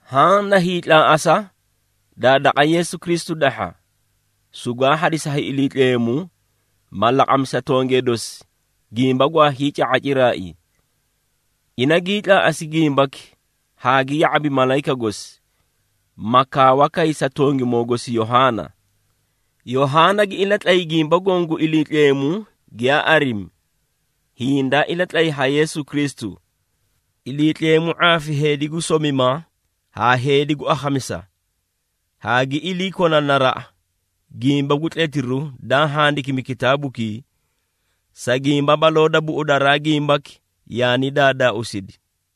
Haã na hiitlaaꞌasa daa daqa Yeesu Kristu dahha, sugwaa hadisi ha Iliitleemu, ma laqami sa tongee dosi gimba gwaa hiica⁄a ciraai. Ina gii tlaaꞌasi gimbaki haa gi ya⁄abi malayika gosi ma kaawa kay sa tongimoo gosi Yohaana. Yohaana gi ilatlay gimba goõ gu Iliitleemu giyaa arimi, hiĩ daa ilatlay ha Yeesu Kristu. Iliitleemu ⁄aafi heedi gu somima haa heedi gu akhamisa, haa gi iliikona naraꞌa, gimba gu tletiru daa handikimi kitaabukii. Sa gimba baloo da buꞌudaraa gimbaki yaani daadaauusidi.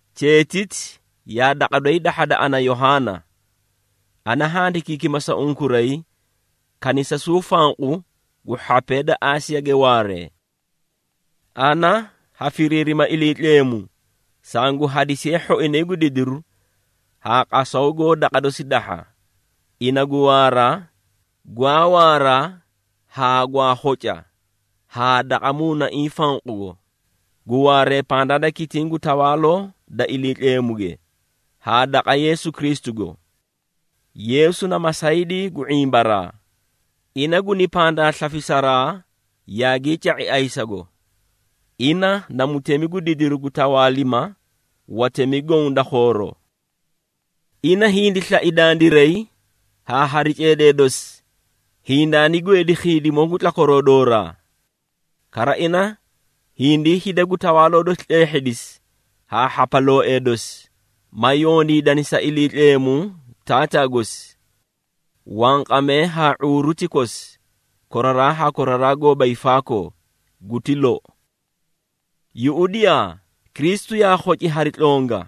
Cheetiti yaa daqa doyi dahhada ana Yohaana. Ana handikiikima sa unkuray kanisasuu fanqu gu hhapee da Aasiyage waaree. Ana ha firiirima Iliitleemu sangu hadisiye hhoinay gu didiru haa qasaw goó daqa dosi dahha, ina gu waara, gwaa waara haa gwaa khoca haa daqa Muunaiĩ fanqugo, gu waaree pandaa da kitiĩ gu tawaaloo da Iliitleemuge, haa daqa Yeesu Kristugo. Yeesu na masaydii gu ⁄imbaraa, ina guni pandaa slafisaraa yaagii ca⁄i ayisago, ina na mutemi gu didiru gu tawaalima watemi goõ da khooroo. Ina hindi slai dandiray haa hari ceedee dosi, hindaani gweedi khiidimoo gu tlakwaroo dooraa. Kara ina hindii hida gu Tawaaloo dosi tleehhedisi haa hhapalooee dosi, ma yondiidani sa Iliitleemu Taataa gosi. Wanqamee haa ⁄uuru ti kosi, koraraa haa koraraa goóba hiifaakoo! Guti lou. Yuꞌudiyaa! Kristu yaa khoci hari tlonga,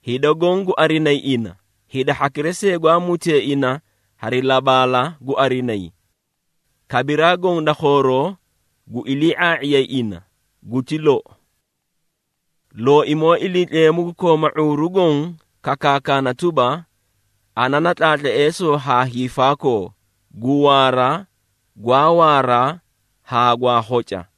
hida goõ gu arinayi ina, hida hhakira see gwaa mutee ina hari labaala gu arinayi. Kabiraa goõ da khooroo gu ilii⁄aa⁄iyay ina. Guti lou. Looimoo Iliitleemu gu kooma ⁄uuru Goõ kakaakana tuba, “Ana na Tlaatleesoo haa Hiifaakoo, gu waara, gwaa waara, haa gwaa khoca.”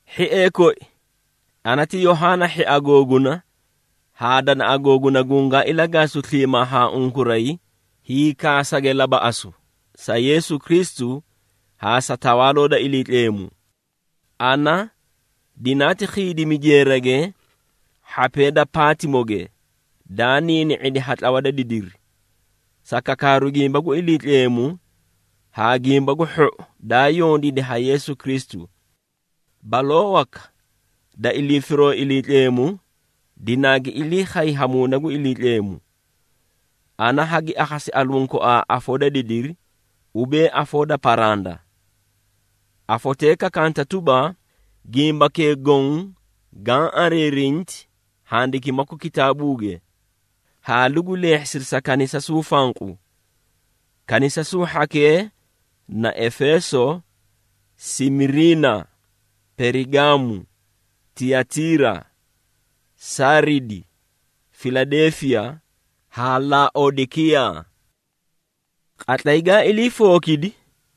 Hhiee koi, ana ti Yohaana hhia googuna haa danaꞌa googuna gungaa ilagaasu sliimaa ha unkuray hiikaasage labaꞌasu, sa Yeesu Kristu haa sa Tawaaloo da Iliitleemu. Ana dinaati khiidimi jeerage hhapee da Paatimoge daa niini⁄idi ha tlawa da didiri, sa kakaaru gimba gu Iliitleemu haa gimba gu hhou daa yondiidi ha Yeesu Kristu. Baloo waka da ilii firoo Iliitleemu, dinaagi ilii khay ha Muuna gu Iliitleemu. Ana hagi akhasi aluũ koaa afoo da didiri, ubee afoo da paranda. Afotee kakanta tuba, “Gimbakee goõ gaã ariirinti handikimaku kitaabuuge, haa lugu leehhisida sa kanisasuu fanqu. Kanisasuu hhakee na Efeeso, Simiirina, Perigaamu, Tiyatiira, Saaridi, Filadeefiya haa Laodekiyaa.” Qatlay gaa ilii fookidi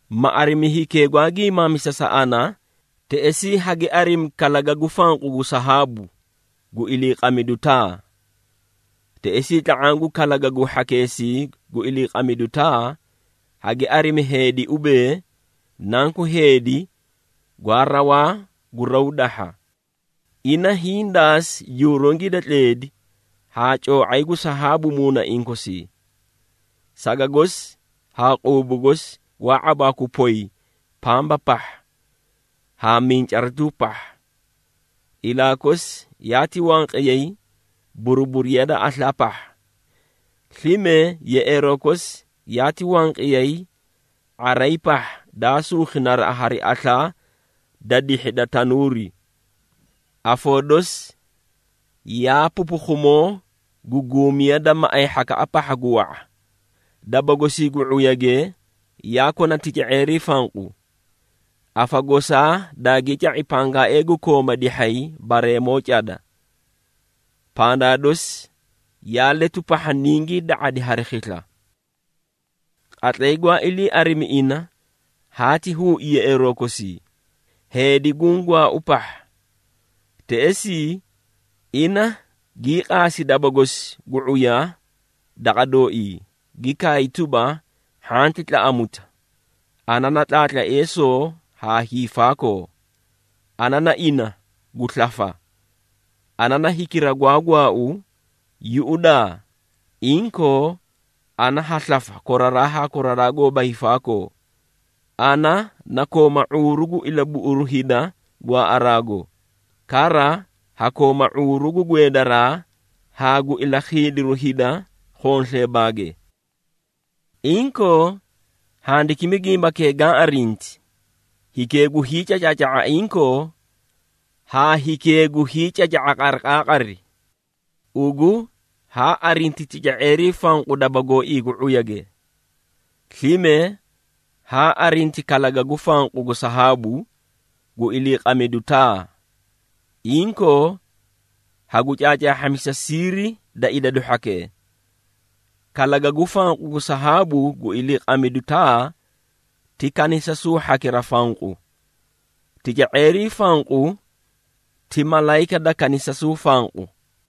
ma arimi hikee gwaa giimaamisa sa ana, teꞌesii hagi arimi kalagagu fanqu gu sahaabu, gu iliiqamidu taa. Teꞌesii tla⁄aã gu kalagagu hhakeesii gu iliiqamidu taa, hagi arimi heedi ubee, Nanku Heedi gwaa rawaa gu raw dahha. Ina hiĩ daasi jurungii da tleedi haa coo⁄ay gu sahaabu muunaiĩ kosii. Saga gosi haa quubu gosi gwaa ⁄abaaku poy pamba pahha haa mincaratuu pahha. Ilaa kosi yaati wanqiyay buruburiya da aslaa pahha. Slime, yeꞌeeroo kosi yaati wanqiyay ⁄aray pahha daa suukhi naraꞌa hari aslaa da dihhi da tanuuri. Afoo dosi yaa pupukhumoo gu guumiya da maꞌay hhaka pahha gu wa⁄a. Daba gosii gu ⁄uyage yaa kona tica⁄eerii fanqu. Afa goosaa daagii ca⁄i pangaa gu kooma dihhay bareemoo cada. Pandaa dosi yaa letu pahha ningii da⁄adi hari khisla. Qatlay gwaa ilii arimi ina, haati huui yeꞌeeroo kosii, heedi guũ gwaau pahha. Teꞌesii, ina gii qaasi daba gosi gu ⁄uya daqa dooii, gi kaay tuba, “Hhanti tlaꞌamuta! Ana na Tlaatleesoo haa hiifaakoo. Ana na ina gu slafa! Ana na hikira gwaa gwaau, yuꞌudaa, inkoo ana ha slafa koraraa haa koraraa goóba hiifaakoo. Ana na kooma ⁄uuru gu ilabuꞌuru hida gwaaꞌaraago, kara ha kooma ⁄uuru gu gweedaraa haa gu ilakhiidiru hida khonsleebaage. Inkoo, handikimi gimbakee gaã arinti, hikee gu hiicacaaca⁄a inkoo, haa hikee gu hiicaca⁄a qariqaaqari. Ugu haa arinti tica⁄eerii fanqu daba gooii gu ⁄uyage. Slime haa arinti kalagagu fanqu gu sahaabu, gu iliiqamidu taa. Inkoo, hagu caacaahhamisa siiri da idadu hhakee. Kalagagu fanqu gu sahaabu gu iliqamidu taa ti kanisasuu hhakira fanqu. Tica⁄eerii fanqu ti malayika da kanisasuu fanqu.”